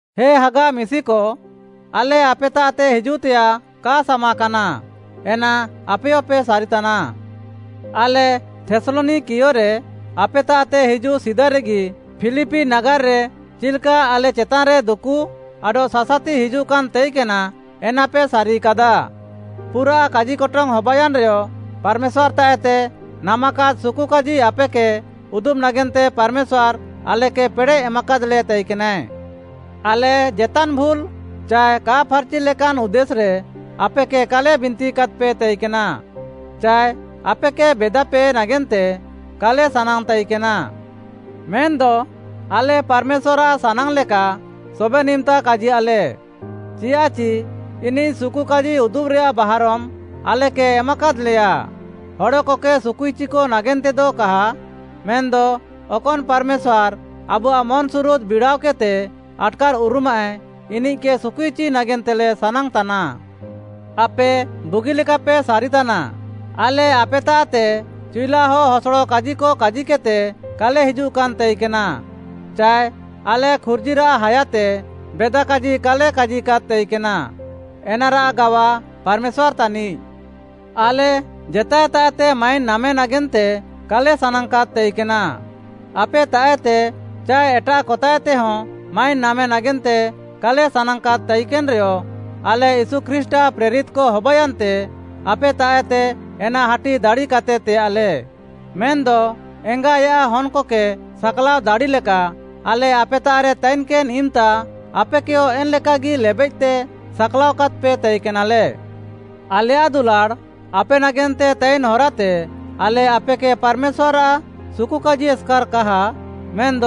ହେ ହାଗା ମିଶିକ, ଆଲେ ଆପେତାଃତେ ହିଜୁଃତେୟାଃ କା ସାମାକାନା, ଏନା ଆପେୟପେ ସାରିତାନା। ଆଲେ ଥେସ୍‌ଲନିକାରେ ଆପେତାଃତେ ହିଜୁଃ ସିଦାରେଗି ଫିଲିପି ନାଗାର୍‌ରେ ଚିଲ୍‌କା ଆଲେ ଚେତାନ୍‌ରେ ଦୁକୁ ଆଡଃ ସାସାତି ହିଜୁଃକାନ୍‌ ତାଇକେନା, ଏନାପେ ସାରିକାଦା। ପୁରାଃ କାଜିକଟଙ୍ଗ୍‌ ହବାୟାନ୍‌ରେୟ ପାର୍‌ମେଶ୍ୱାର୍‌ତାଃଏତେ ନାମାକାଦ୍‌ ସୁକୁକାଜି ଆପେକେ ଉଦୁବ୍‌ ନାଗେନ୍ତେ ପାର୍‌ମେଶ୍ୱାର୍‍ ଆଲେକେ ପେଡ଼େଃ ଏମାକାଦ୍‌ଲେ ତାଇକେନାଏଁ। ଆଲେ ଜେତାନ୍‌ ଭୁଲ୍‌ ଚାଏ କା ଫାର୍‌ଚି ଲେକାନ୍‌ ଉଦ୍ଦେଶ୍‌ରେ ଆପେକେ କାଲେ ବିନ୍ତିକାଦ୍‌ପେ ତାଇକେନା, ଚାଏ ଆପେକେ ବେଦାପେ ନାଗେନ୍ତେ କାଲେ ସାନାଙ୍ଗ୍‌ ତାଇକେନା। ମେନ୍‌ଦ ଆଲେ ପାର୍‌ମେଶ୍ୱାର୍‌ଆଃ ସାନାଙ୍ଗ୍‌ଲେକା ସବେନ୍‌ ଇମ୍‌ତା କାଜିୟାଃଲେ, ଚିୟାଃଚି ଇନିଃ ସୁକୁକାଜି ଉଦୁବ୍‌ରେୟାଃ ବାହାରମ୍‌ ଆଲେକେ ଏମାକାଦ୍‌ଲେୟା। ହଡ଼କକେ ସୁକୁଇଚିକ ନାଗେନ୍ତେଦ କା ମେନ୍‌ଦ ଅକନ୍‌ ପାର୍‌ମେଶ୍ୱାର୍‌ ଆବୁଆଃ ମନ୍‌ସୁରୁଦ୍‌ ବିଡ଼ାଅକେଦ୍‌ତେ ଆଟ୍‌କାର୍‌ଉରୁମାଃଏ, ଇନିଃକେ ସୁକୁଇଚି ନାଗେନ୍ତେଲେ ସାନାଙ୍ଗ୍‌ତାନା। ଆପେ ବୁଗିଲେକାପେ ସାରିତାନା, ଆଲେ ଆପେତାଃତେ ଚିଉଲାହ ହସଡ଼ କାଜିକ କାଜିକେଦ୍‌ତେ କାଲେ ହିଜୁଃକାନ୍‌ ତାଇକେନା, ଚାଏ ଆଲେ ଖୁର୍ଜିରାଃ ହାୟାତେ ବେଦା କାଜି କାଲେ କାଜିକାଦ୍‌ ତାଇକେନା, ଏନାରାଃ ଗାୱା ପାର୍‌ମେଶ୍ୱାର୍‌ ତାନିଃ। ଆଲେ ଜେତାଏତାଃଏତେ ମାଇନ୍‌ ନାମେ ନାଗେନ୍ତେ କାଲେ ସାନାଙ୍ଗ୍‌କାଦ୍‌ ତାଇକେନା, ଆପେତାଃଏତେ ଚାଏ ଏଟାଃକତାଃଏତେହଁ ମାଇନ୍‌ ନାମେ ନାଗେନ୍ତେ କାଲେ ସାନାଙ୍ଗ୍‌କାଦ୍‌ ତାଇକେନ୍‌ରେୟ, ଆଲେ ୟୀଶୁ ଖ୍ରୀଷ୍ଟ୍‌ଆଃ ପ୍ରେରିତ୍‌କ ହବାୟାନ୍ତେ ଆପେତାଃଏତେ ଏନା ହାଟି ଦାଡ଼ିକାଦ୍‌ତେ ତେୟାଃଲେ, ମେନ୍‌ଦ ଏଙ୍ଗା ଆୟାଃ ହନ୍‌କକେ ସାକ୍‌ଲାଅ ଦାଡ଼ିଲେକା, ଆଲେ ଆପେତାଃରେ ତାଇକେନ୍‌ ଇମ୍‌ତା ଆପେକେୟ ଏନ୍‌ଲେକାଗି ଲେବେଃତେ ସାକ୍‌ଲାଅ କାଦ୍‌ପେ ତାଇକେନାଲେ। ଆଲେୟାଃ ଦୁଲାଡ଼୍‌ ଆପେ ନାଗେନ୍ତେ ତାଇନ୍‌ ହରାତେ ଆଲେ ଆପେକେ ପାର୍‌ମେଶ୍ୱାର୍‌ଆଃ ସୁକୁକାଜି ଏସ୍‍କାର୍ କାହା, ମେନ୍‌ଦ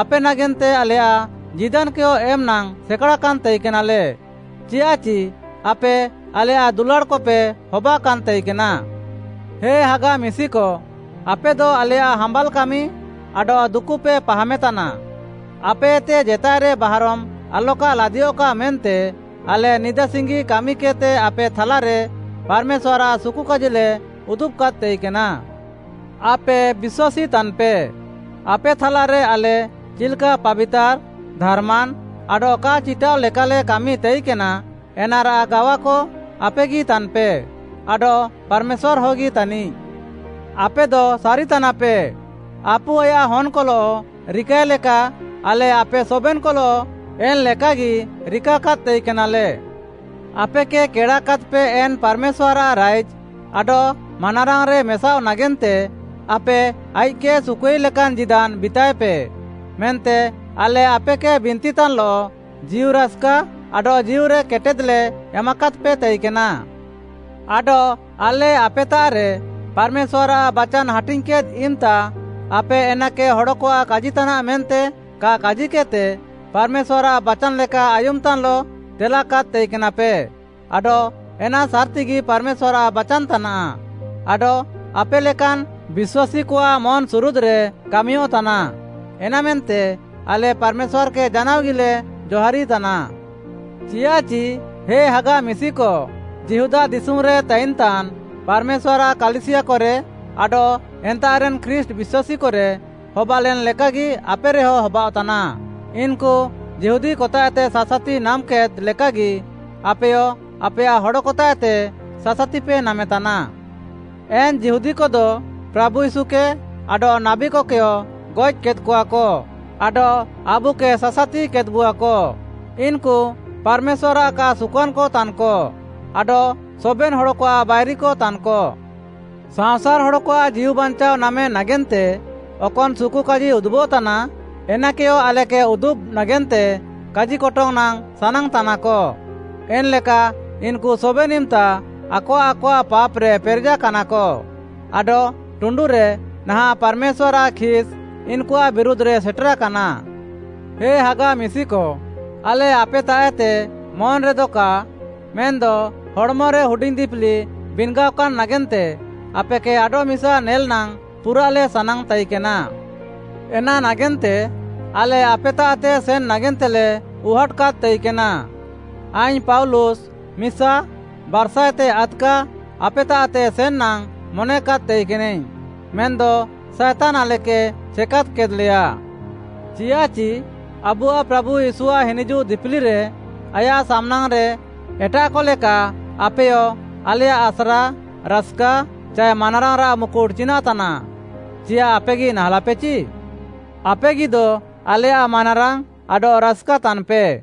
ଆପେ ନାଗେନ୍ତେ ଆଲେୟାଃ ଜୀଦାନ୍‌କେୟ ଏମ୍‌ ନାଙ୍ଗ୍‌ ସେକାଡ଼ାକାନ୍‌ ତାଇକେନାଲେ, ଚିୟାଃଚି ଆପେ ଆଲେୟାଃ ଦୁଲାଡ଼୍‌କପେ ହବାକାନ୍‌ ତାଇକେନା। ହେ ହାଗା ମିଶିକ, ଆପେଦ ଆଲେୟାଃ ହାମ୍ବାଲ୍ କାମି ଆଡଃ ଦୁକୁପେ ପାହାମେତାନା, ଆପେଏତେ ଜେତାଏରେ ବାହାରମ୍ ଆଲକା ଲାଦିୟଃକା ମେନ୍ତେ ଆଲେ ନିଦା ସିଙ୍ଗି କାମିକେଦ୍‌ତେ ଆପେ ଥାଲାରେ ପାର୍‌ମେଶ୍ୱାର୍‌ଆଃ ସୁକୁକାଜିଲେ ଉଦୁବ୍‌କାଦ୍‌ ତାଇକେନା। ଆପେ ବିଶ୍ୱାସୀ ତାନ୍‌ପେ, ଆପେ ଥାଲାରେ ଆଲେ ଚିଲ୍‍କା ପାବିତାର୍‌, ଧାର୍‌ମାନ୍‌ ଆଡଃ କା ଚିଟାଃଅ ଲେକାଲେ କାମି ତାଇକେନା, ଏନାରାଃ ଗାୱାକ ଆପେଗି ତାନ୍‌ପେ ଆଡଃ ପାର୍‌ମେଶ୍ୱାର୍‌ ହଗି ତାନିଃ। ଆପେଦପେ ସାରିତାନା, ଆପୁ ଆୟାଃ ହନ୍‍କଲଃ ରିକାଏ ଲେକା, ଆଲେ ଆପେ ସବେନ୍‌କଲଃ ଏନ୍‌ଲେକାଗିଲେ ରିକାକାଦ୍‌ ତାଇକେନା। ଆପେକେ କେଡ଼ାକାଦ୍‌ପେ ଏନ୍‌ ପାର୍‌ମେଶ୍ୱାର୍‌ଆଃ ରାଇଜ୍‌ ଆଡଃ ମାନାରାଙ୍ଗ୍‌ରେ ମେସାଃଅ ନାଗେନ୍ତେ ଆପେ ଆଇଃକ୍‌କେ ସୁକୁଆଇ ଲେକାନ୍‌ ଜୀଦାନ୍‌ ବିତାଏପେ, ମେନ୍ତେ ଆଲେ ଆପେକେ ବିନ୍ତିତାନ୍‌ଲଃ ଜୀଉରାସ୍‌କା ଆଡଃ ଜୀଉରେ କେଟେଦ୍‌ଲେ ଏମାକାଦ୍‌ପେ ତାଇକେନା। ଆଡଃ ଆଲେ ଆପେତାଃରେ ପାର୍‌ମେଶ୍ୱାର୍‌ଆଃ ବାଚାନ୍‌ ହାଟିଙ୍ଗ୍‌କେଦ୍‌ ଇମ୍‌ତା, ଆପେ ଏନାକେ ହଡ଼କଆଃ କାଜିତାନାଃ ମେନ୍ତେ କା କାଜିକେଦ୍‌ତେ, ପାର୍‌ମେଶ୍ୱାର୍‌ଆଃ ବାଚାନ୍‌ ଲେକା ଆୟୁମ୍‌ତାନ୍‌ଲଃ ତେଲାକାଦ୍‌ ତାଇକେନାପେ। ଆଡଃ ଏନା ସାର୍‌ତିଗି ପାର୍‌ମେଶ୍ୱାର୍‌ଆଃ ବାଚାନ୍‌ ତାନାଃ, ଆଡଃ ଆପେ ଲେକାନ୍‌ ବିଶ୍ୱାସୀକଆଃ ମନ୍‌ସୁରୁଦ୍‌ରେ କାମିୟଃତାନା। ଏନାମେନ୍ତେ ଆଲେ ପାର୍‌ମେଶ୍ୱାର୍‌କେ ଜାନାଅଗିଲେ ଜହାରିତାନା। ଚିୟାଃଚି, ହେ ହାଗା ମିଶିକ, ଯିହୁଦା ଦିଶୁମ୍‌ରେ ତାଇନ୍‍ତାନ୍ ପାର୍‌ମେଶ୍ୱାର୍‌ଆଃ କାଲିସିୟାକରେ ଆଡଃ ଏନ୍ତାଃରେନ୍‌ ଖ୍ରୀଷ୍ଟ୍‌ ବିଶ୍ୱାସୀକରେ ହବାଲେନ୍‌ ଲେକାଗି ଆପେରେହଁ ହବାଅଃତାନା। ଇନ୍‌କୁ ଯିହୁଦୀକତାଃଏତେ ସାସାତି ନାମ୍‌କେଦ୍‌ ଲେକାଗି ଆପେୟ ଆପେୟାଃ ହଡ଼କତାଃଏତେ ସାସାତିପେ ନାମେତାନା। ଏନ୍‌ ଯିହୁଦୀକଦ ପ୍ରାଭୁ ୟୀଶୁକେ ଆଡଃ ନାବୀକକେୟ ଗଏଃକେଦ୍‍କଆକ ଆଡଃ ଆବୁକେ ସାସାତିକେଦ୍‌ବୁଆକ। ଇନ୍‌କୁ ପାର୍‌ମେଶ୍ୱାର୍‌ଆଃ କା ସୁକୁଆନ୍‌କ ତାନ୍‌କ ଆଡଃ ସବେନ୍‌ ହଡ଼କଆଃ ବାଇରିକ ତାନ୍‌କ। ସାଅଁସାର୍‌ ହଡ଼କଆଃ ଜୀଉବାଞ୍ଚାଅ ନାମେ ନାଗେନ୍ତେ ଅକନ୍‌ ସୁକୁକାଜି ଉଦୁବଃତାନା, ଏନାକେୟ ଆଲେକେ ଉଦୁବ୍‌ ନାଗେନ୍ତେ କାଜିକଟଙ୍ଗ୍‌ ନାଙ୍ଗ୍‌ ସାନାଙ୍ଗ୍‌ତାନାକ। ଏନ୍‌ଲେକା ଇନ୍‌କୁ ସବେନ୍‌ ଇମ୍‌ତା ଆକଆଃ ଆକଆଃ ପାପ୍‌ରେ ପେରେଜାକାନାକ। ଆଡଃ ଟୁଣ୍ଡୁରେ ନାହାଁଃ ପାର୍‌ମେଶ୍ୱାର୍‌ଆଃ ଖିସ୍‌ ଇନ୍‌କୁଆଃ ବିରୁଧ୍‌ରେ ସେଟେରାକାନା। ହେ ହାଗା ମିଶିକ, ଆଲେ ଆପେତାଃଏତେ ମନ୍‌ରେଦ କା ମେନ୍‌ଦ ହଡ଼୍‌ମରେ ହୁଡିଙ୍ଗ୍‌ ଦିପିଲି ବିନ୍‌ଗାଅକାନ୍‌ ନାଗେନ୍ତେ ଆପେକେ ଆଡଃମିସା ନେଲ୍‌ ନାଙ୍ଗ୍‌ ପୁରାଃଲେ ସାନାଙ୍ଗ୍‌ ତାଇକେନା। ଏନା ନାଗେନ୍ତେ ଆଲେ ଆପେତାଃତେ ସେନ୍‌ ନାଗେନ୍ତେଲେ ଉହାଟ୍‌କାଦ୍‌ ତାଇକେନା, ଆଇଙ୍ଗ୍‌ ପାଉଲୁସ୍‌ ମିସା, ବାର୍‌ସାଏତେ ଆଦ୍‌କା ଆପେତାଃତେ ସେନ୍ ନାଙ୍ଗ୍‌ ମନେକାଦ୍‌ ତାଇକେନାଇଙ୍ଗ୍‌, ମେନ୍‌ଦ ସାଏତାନ୍‌ ଆଲେକେ ଛେକାଦ୍‌ କେଦ୍‌ଲେୟା। ଚିୟାଃଚି ଆବୁଆଃ ପ୍ରାଭୁ ୟୀଶୁଆଃ ହିନିଜୁଃ ଦିପିଲିରେ ଆୟାଃ ସାମ୍‌ନାଙ୍ଗ୍‌ରେ ଏଟାଃକ ଲେକା ଆପେୟ ଆଲେୟାଃ ଆସ୍ରା, ରାସ୍‌କା ଚାଏ ମାନାରାଙ୍ଗ୍‌ରାଃ ମୁକୁଟ୍‌ ଚିନାଃତାନାଃ? ଚିୟାଃ ଆପେଗି ନାହାଁଲାପେଚି? ଆପେଗିଦ ଆଲେୟାଃ ମାନାରାଙ୍ଗ୍‌ ଆଡଃ ରାସ୍‌କା ତାନ୍‌ପେ।